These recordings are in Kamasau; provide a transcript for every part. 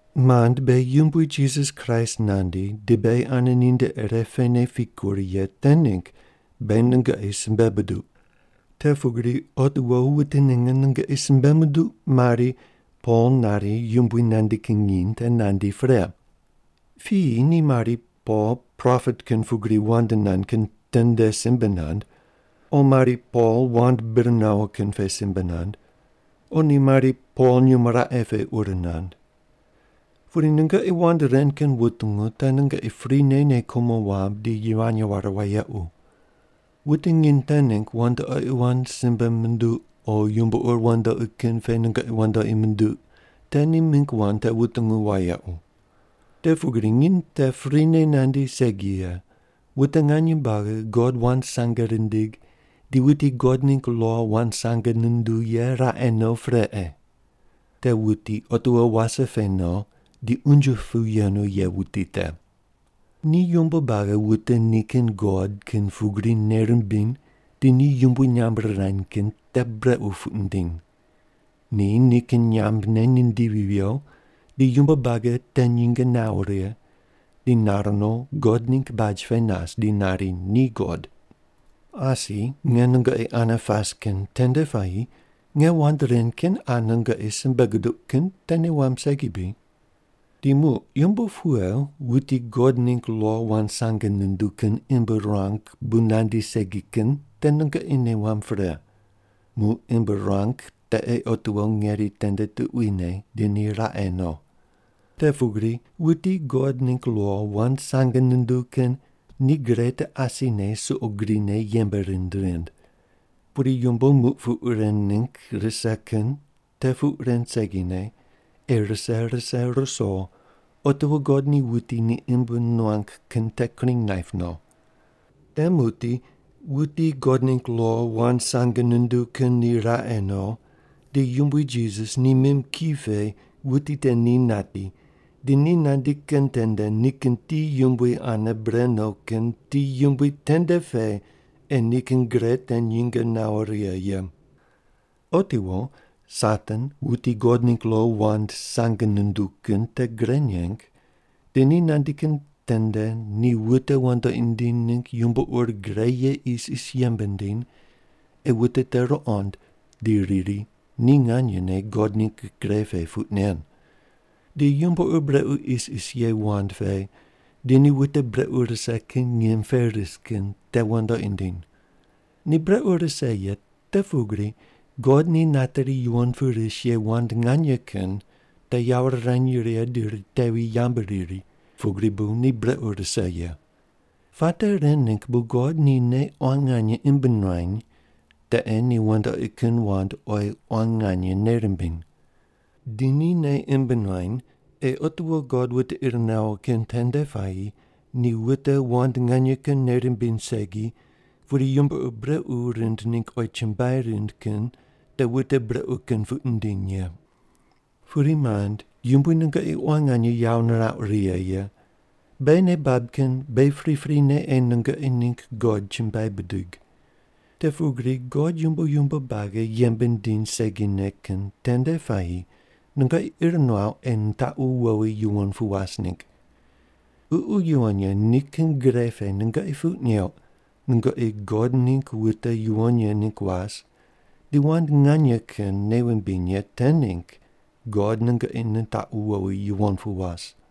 Mand, beghi Yumbui Jisas Kraist nandi di beghi ane ninde irepene pikur ye te ningg beghi nungoqi simbe buduq: Te pugri otiwo wute ninge nungoqi simbe munduq mari “Pol nari Yumbui nandi kin nginy te nandi pre.” Piyi ni mari “Pol propet kin pugri wand nand kin tende simbe nand,” o mari “Pol wand bir nawo kin pe simbe nand,” o ni mari “Pol nyumo raqe pe ur nand.” Pudi nungoqi wand ren kin wutungu te nungoqi prine nei kumo wamb di yivany ware wayequ. Wute nginy te ningg wandoqi wand simbe munduq o yumbo ur wandoqi kin pe nungoqi wandoqi munduq te ni mingg wand te wutungu wayequ. Te pugri nginy te prine nandi segi ye, wute nganye buagi God wand sange rindig di wuti God ningg lo wand sange nunduw ye raqe no pre ei. Te wuti otiwo wase pe no di unje pu yenu ye wuti te. Ni yumbo buagi wute nikin god kin pugri nei rimbiny di ni yumbui nyamb rirany kin te brequ puq nindiny. Ni nikin nyambne nindivi viyo di yumbo buagi te nyinge nawo righe, di nar no God ningg baj pe nas di nari ni God. Asi nge nungoqi ane pas kin tende puayi nge wand ren kin qa nungoqi simbe guduq kin te nei wamb segi bri? Di muq yumbo pughe wuti God ningg lo wand sange nunduw kin imb ruang bu nandi segi kin te nungoqi nei wamb pre. Muq imb ruang te ei otiwo ngeri tende tuquine di ni raqe no. Te pugri wuti God ningg lo wand sange nunduw kin ni gre te asine suqo grine yembe rind rind. Pudi yumbo muq puq ren ningg rise kin te puq ren segine ei rise rise ruso otiwo God ni wuti ni imb nuang kin te kring naip no. Te muqdi wuti God ningg lo wand sange nunduw kin ni raqe no, di Yumbui Jisas ni mim ki pe wuti te ni nati di ni nandi kin tende nikin ti yumbui ane bre no kin ti yumbui tende pe ei nikin gre te nyinge nawo righe ye. Otiwo Satan wuti God ningg lo wand sange nunduw kin te gre neng di ni nandi kin tende ni wute wandoqi nindiny ningg yumbo ur gre ye isis yembe nindiny ei wute te ruqond di riri ni nganyene God ningg gre pe puq nen. Di yumbo ur brequ isis ye wand pe di ni wute brequ rise kin ngim pe ris kin te wandoqi nindiny. Ni brequ rise ye te pugri God ni nateri yuwon pu ris ye wand nganye kin te yawo rirany righe di ritevi yambu riri pugri bu ni brequ rise ye. Puate ren ningg bu God ni nei quan nganye imb nuany te ei ni wandoqi kin wand oyi quan nganye nei rimbiny. Di ni nei imb nuany ei otiwo God wute ir nawo kin tende puayi ni wute wand nganye kin nei rimbiny segi pudi yumbo ur brequ rind ningg oyi chumbuai rind kin te wute brequ kin puq nindiny ye. Pudi, mand, Yumbui nungoqi quan nganye yawo nirauq righe ye, beghi nei bab kin beghi priprine ei nungoqi ningg God chumbuai bidig. Te pugri God yumbo yumbo buagi yembe nindiny segine kin tende puayi nungoqi ir nuauq ei nitaqu wowi yuwon pu was ningg. Ququ Yuwon Ye nikin gre pe nungoqi puq neuq nungoqi God ningg wute yuwon ye ningg was di wand nganye kin nei wumbiny ye te ningg God nungoqi nitaqu wowi yuwon pu was.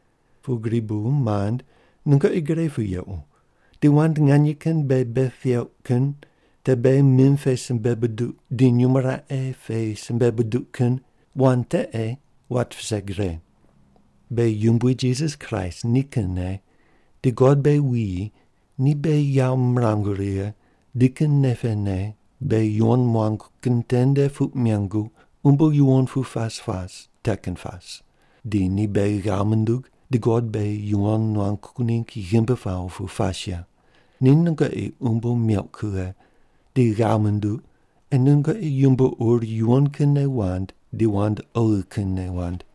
Pugri bu, mand, nungoqi gre pu yequ di wand nganye kin beghi bei peuq kin, te beghi mim pe simbe buduq di nyumo raqe pe simbe buduq kin, wand te ei wat vise gre. Beghi Yumbui Jisas Kraist nikinne di God beghi wuyi ni beghi yawo mirangu righe di nikin nei pene beghi yuwon muangu kin tende puq mengu umbo yuwon pu pas pas te kin pas, di ni beghi ghav mundug di God beghi yuwon nuangu ningg ghimbi pawo pu pas ye, ni nungoqi umbo meuq kughe di ghav munduq ei nungoqi yumbo ur yuwon kinne wand di wand oghi kinne wand.